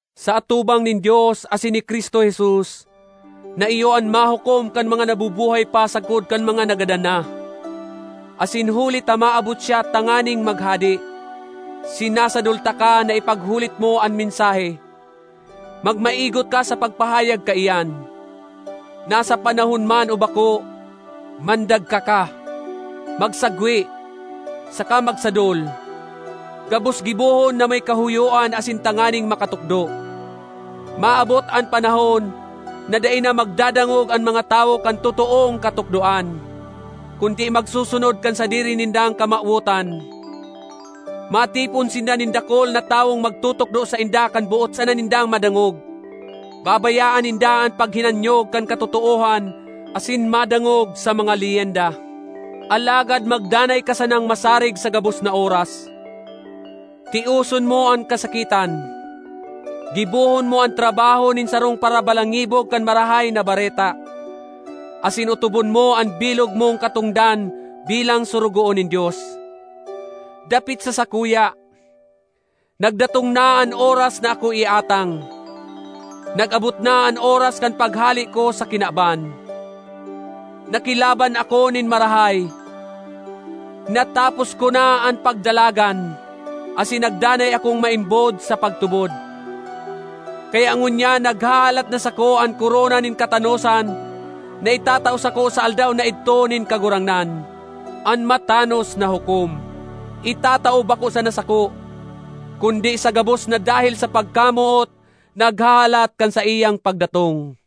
Sa atubang nin Dios asin ni Cristo Jesus na iyo an mahukom kan mga nabubuhay pa sagkod kan mga nagadan na, asin huli ta maabot siya tanganing maghade, sinasadol taka na ipaghulit mo an mensahe, magmaigot ka sa pagpahayag kaiyan, nasa panahon man o bako; mandagka ka, magsagwe, saka magsadol; gabos gibohon na may kahoyoan asin tanganing makatukdo. Maabot an panahon na dai na magdadangog an mga tawo kan totoong katukdoan, kundi magsusunod kan sadiri nindang kamawotan. Matipon sinda nin dakul na tawong magtutukdo sainda kan boot sana nindang madangog. Babayaan ninda an paghinanyog kan katotoohan asin madangog sa mga leyenda. Alagad magdanay ka sanang masarig sa gabos na oras; tioson mo an kasakitan, gibohon mo an trabaho nin sarong parabalangibog kan Marahay na Bareta, asin otobon mo an bilog mong katongdan bilang sorogoon nin Dios. Dapit sa sakuya, nagdatong na an oras na ako iatang; nag-abot na an oras kan paghale ko sa kinaban. Nakilaban ako nin marahay, natapos ko na an pagdalagan, asin nagdanay akong maimbod sa pagtubod. Kaya ngunyan naghahalat na sako an korona nin katanosan na itatao sako sa Aldaw na idto nin Kagurangnan, an matanos na hukom, itatao bako sana sako, kundi sa gabos na dahel sa pagkamoot naghahalat kan saiyang pagdatong.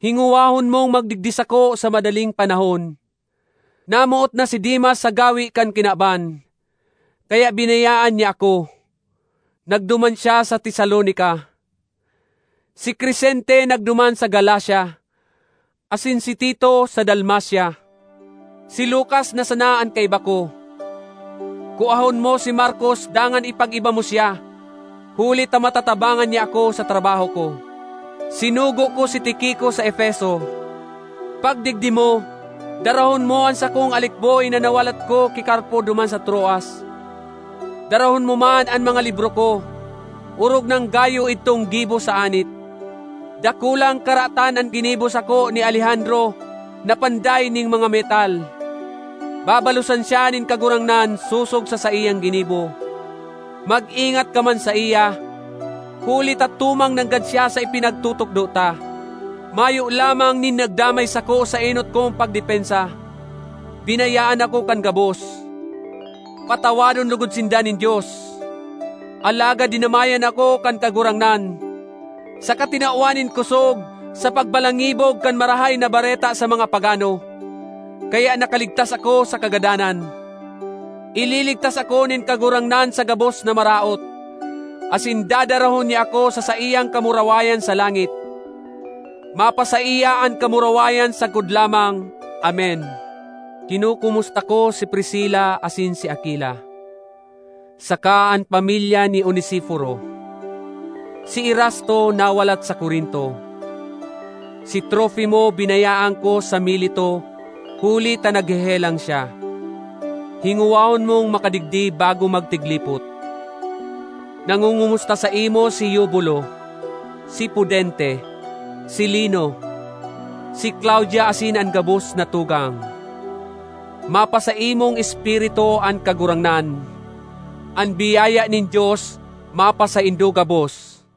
Hingowahon mong magdigdi sako sa madaling panahon. Namoot na si Demas sa gawe kan kinaban, kaya binayaan niya ako; nagduman siya sa Tesalonica. Si Crescente nagduman sa Galacia, asin si Tito sa Dalmacia. Si Lukas na sana an kaiba ko. Kuahon mo si Markos dangan ipag-iba mo siya, huli ta matatabangan niya ako sa trabaho ko. Sinugo ko si Tiquico sa Efeso. Pagdigdi mo, darahon mo an sakong alikboy na nawalat ko ki Carpo duman sa Troas; darahon mo man an mga libro ko, orog nang gayo idtong gibo sa anit. Dakulang karatan an ginibo sako ni Alejandro na panday nin mga metal; babalosan siya nin Kagurangnan sosog sa saiyang ginibo. Mag-ingat ka man saiya, huli ta tumang nanggad siya sa ipinagtutukdo ta. Mayo lamang nin nagdamay sako sa enot kong pagdepensa; binayaan ako kan gabos. Patawadon logod sinda nin Dios! Alagad dinamayan ako kan Kagurangnan saka tinawan nin kosog sa pagbalangibog kan Marahay na Bareta sa mga pagano, kaya nakaligtas ako sa kagadanan. Ililigtas ako nin Kagurangnan sa gabos na maraot, asin dadarahon niya ako sa saiyang kamurawayan sa langit. Mapasaiya an kamurawayan sagkod lamang! Amen. Kinokomusta ko si Priscila asin si Aquila, saka an pamilya ni Onesiforo. Si Erasto nawalat sa Corinto; si Trofimo binayaan ko sa Mileto huli ta naghehelang siya. Hingowahon mong makadigdi bago magtiglipot. Nangongomusta saimo si Eubulo, si Pudente, si Lino, si Claudia asin an gabos na tugang. Mapasaimong espiritu an Kagurangnan. An biyaya nin Dios mapasaindo gabos.